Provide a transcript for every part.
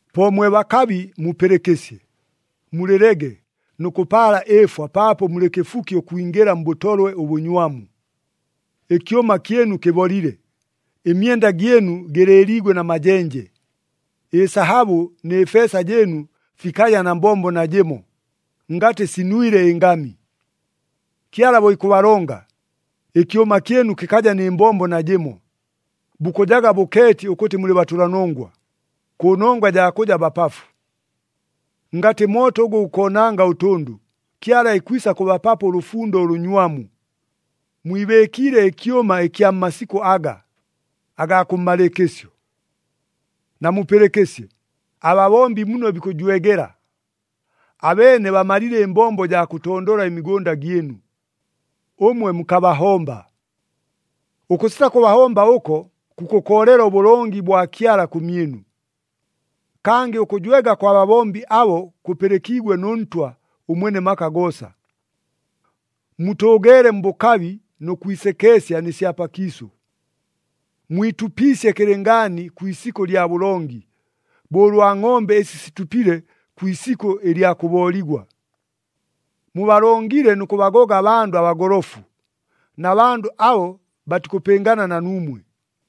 Po mwe bakabi mupɨlɨkɨsye! Mulɨlege nʉ kʉpaala ɨɨfwa paapo mulɨ kɨfuki ʉkwingɨla mbʉtolwe ʉbʉnywamu. Ɨkyʉma kyɨnu kɨbolile, ɨmyenda gyɨnu gɨlɨɨliigwe na majenje. Ɨsahabʉ nɨ feesa jɨɨnu fikaja na mbombo najɨmo, ngatɨ sinwile ɨngami. Kyala bo ikʉbalonga, ɨkyʉma kyɨnu kɨkaja nɨ mbombo najɨmo, bukʉjaga bʉkeeti ʉkʉtɨ mulɨ batʉlanongwa, kʉnongwa jaa kʉja bapafu. Ngatɨ mooto ʉgʉ gukoonanga ʉtʉndʉ, Kyala ikwisa kʉbapapo ʉlʉfundo ʉlʉnywamu. Mwibɨɨkiile ɨkyʉma ɨkya mmasikʉ aga, agaa kʉmmalɨɨkɨsyo. Namupɨlɨkɨsye, ababombi muno bikʉjwegela! Abeene bamalile ɨmbombo jaa kʉtondola ɨmigʉnda gyɨnu, ʉmwe mukabahomba. Ʉkʉsita kʉbahomba ʉko kukʉkoolela ʉbʉlongi bwa Kyala kʉmyɨnu. Kangɨ ʉkʉjwega kwa babombi abo kʉpɨlɨkiigwe nʉ Ntwa ʉMwene maka goosa. Mutʉʉgeele mbʉkabi nʉ kwisekeesya nɨ sya pakiisʉ. Mwitupiisye kɨlɨngaani kwi isikʉ lya bʉlongi, bo ʉlwa ngʼombe ɨsi situpile kwi isikʉ ɨlya kʉbooligwa. Mubalongile nʉ kʉbagoga abandʉ abagolofu, na bandʉ abo batikʉpɨngana na nuumwe.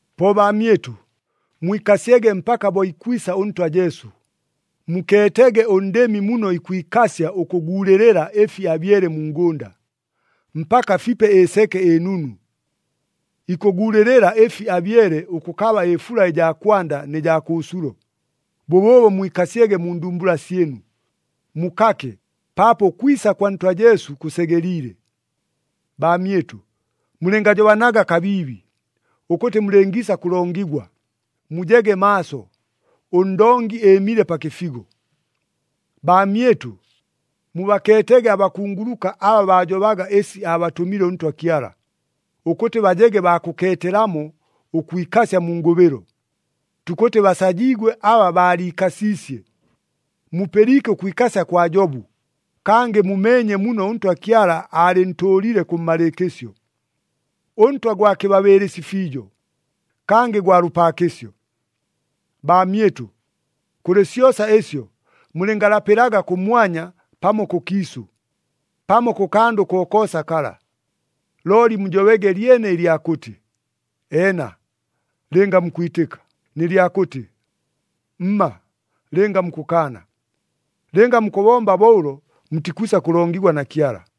Po baamyɨtʉ, mwikasyege mpaka bo ikwisa ʉNtwa Jesu. Mukeetege ʉndɨmi muno ikwikasya ʉkʉguulɨlɨla ɨfi abyele mu ngʉnda, mpaka fipe ɨseke ɨnunu. Ikʉguulɨlɨla ɨfi abyele ʉkʉkaba ɨfula ɨjaa kwanda nɨ jaa kʉʉsulo. Bʉbʉʉbo mwikasyege mu ndumbula syɨnu, mukake, paapo ʉkwisa kwa Ntwa Jesu kʉsegeliile. Baamyɨtʉ, mulɨngajobanaga kabiibi, ʉkʉtɨ mulɨngiisa kʉlongigwa. Mujege maaso! ɄNdongi ɨɨmile pa kɨfigo! Baamyɨtʉ, mubakeetege abakunguluka aba baajobaga ɨsi aabatʉmile ʉNtwa Kyala, ʉkʉtɨ bajege baa kʉkeetelamo ʉkwikasya mu ngʉbɨlo. Tukʉtɨ basajiigwe aba baaliikasiisye. Mupɨliike ʉkwikasya kwa Jobu, kangɨ mumeenye muno ʉNtwa Kyala aalɨntʉʉlile kʉmmalɨɨkɨsyo. ɄNtwa gwa kɨbabɨɨlɨsi fiijo, kangɨ gwa lʉpaakɨsyo. Baamyɨtʉ, kʉlɨ syosa ɨsyo mulɨngalapɨlaga kʉmwanya pamo kʉkiisʉ, pamo kʉ kandʉ kokoosa kala. Looli mujobege lyene ɨlya kʉtɨ, “Eena,” lɨnga mukwitɨka, nɨ lyakʉtɨ, “Mma,” lɨnga mukʉkaana. Lɨnga mukʉbomba bo ʉlo mutikwisa kʉlongigwa na Kyala.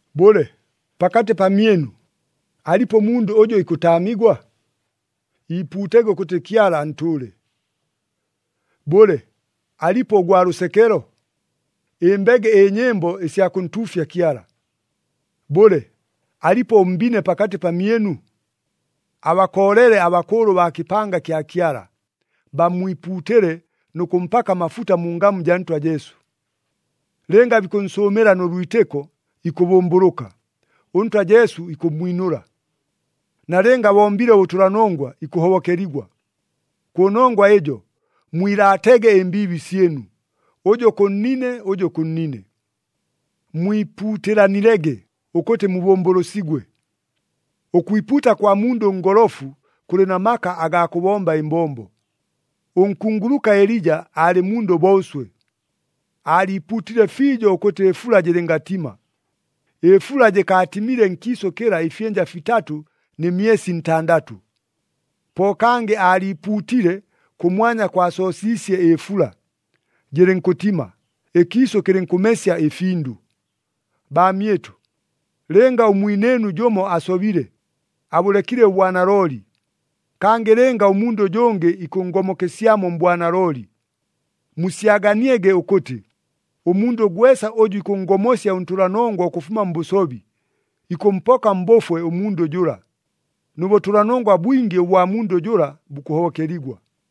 Bʉle, pakatɨ pamyɨnu, alipo ʉmundʉ ʉjʉ ikʉtaamigwa? Iipuutege ʉkʉtɨ Kyala antʉʉle. Bʉle, alipo ʉgwa lʉsekelo? Ɨmbege ɨnyɨmbo ɨsya kʉntuufya Kyala. Bʉle, alipo ʉmbine pakatɨ pamyɨnu? Abakoolele abakʉʉlʉ baa kɨpanga kya Kyala, bammwipuutɨle nʉ kʉmpaka amafuta mu ngamu jaa Ntwa Jesu. Lɨnga bikʉnsʉʉmɨla nʉ lwitɨko, ikʉbʉmbʉlʉka, ʉNtwa Jesu ikʉmmwinʉla. Nalɨnga abombile ʉbʉtʉlanongwa, ikʉhobokeligwa. Kʉnongwa ɨjo mwilaatege ɨmbiibi syɨnu, ʉjʉ kʉ nnine, ʉjʉ kʉ nnine. Mwipuutɨlanilege ʉkʉtɨ mubʉmbʉlʉsigwe. Ʉkwipuuta kwa mundʉ ʉngolofu kʉlɨ na maka agaa kʉbomba ɨmbombo. Ʉnkunguluka Elija aalɨ mundʉ bo ʉswe. Aaliipuutile fiijo ʉkʉtɨ ɨfula jɨlɨngatima, ɨfula jɨkaatimile nkiisʉ kɨla ɨfyɨnja fitatʉ nɨ myesi ntandatʉ. Po kangɨ aaliipuutile, kʉmwanya kwasoosiisye ɨfula, jɨlɨnkʉtima, ɨkiisʉ kɨlɨnkʉmesya ɨfindʉ. Baamyɨtʉ, lɨnga ʉmwinɨɨnu jʉmo asobile, abʉlekile ʉbwanalooli, kangɨ lɨnga ʉmundʉ ʉjʉngɨ ikʉnngomokesyamo mbwanalooli, musyaganiege ʉkʉtɨ, ʉmundʉ gwesa ʉjʉ ikʉnngomosya ʉntʉlanongwa ʉkʉfuma mbʉsobi, ikʉmpoka mbʉfwe ʉmundʉ jʉla, nʉ bʉtʉlanongwa bwingi ʉbwa mundʉ jʉla bukʉhobokeligwa.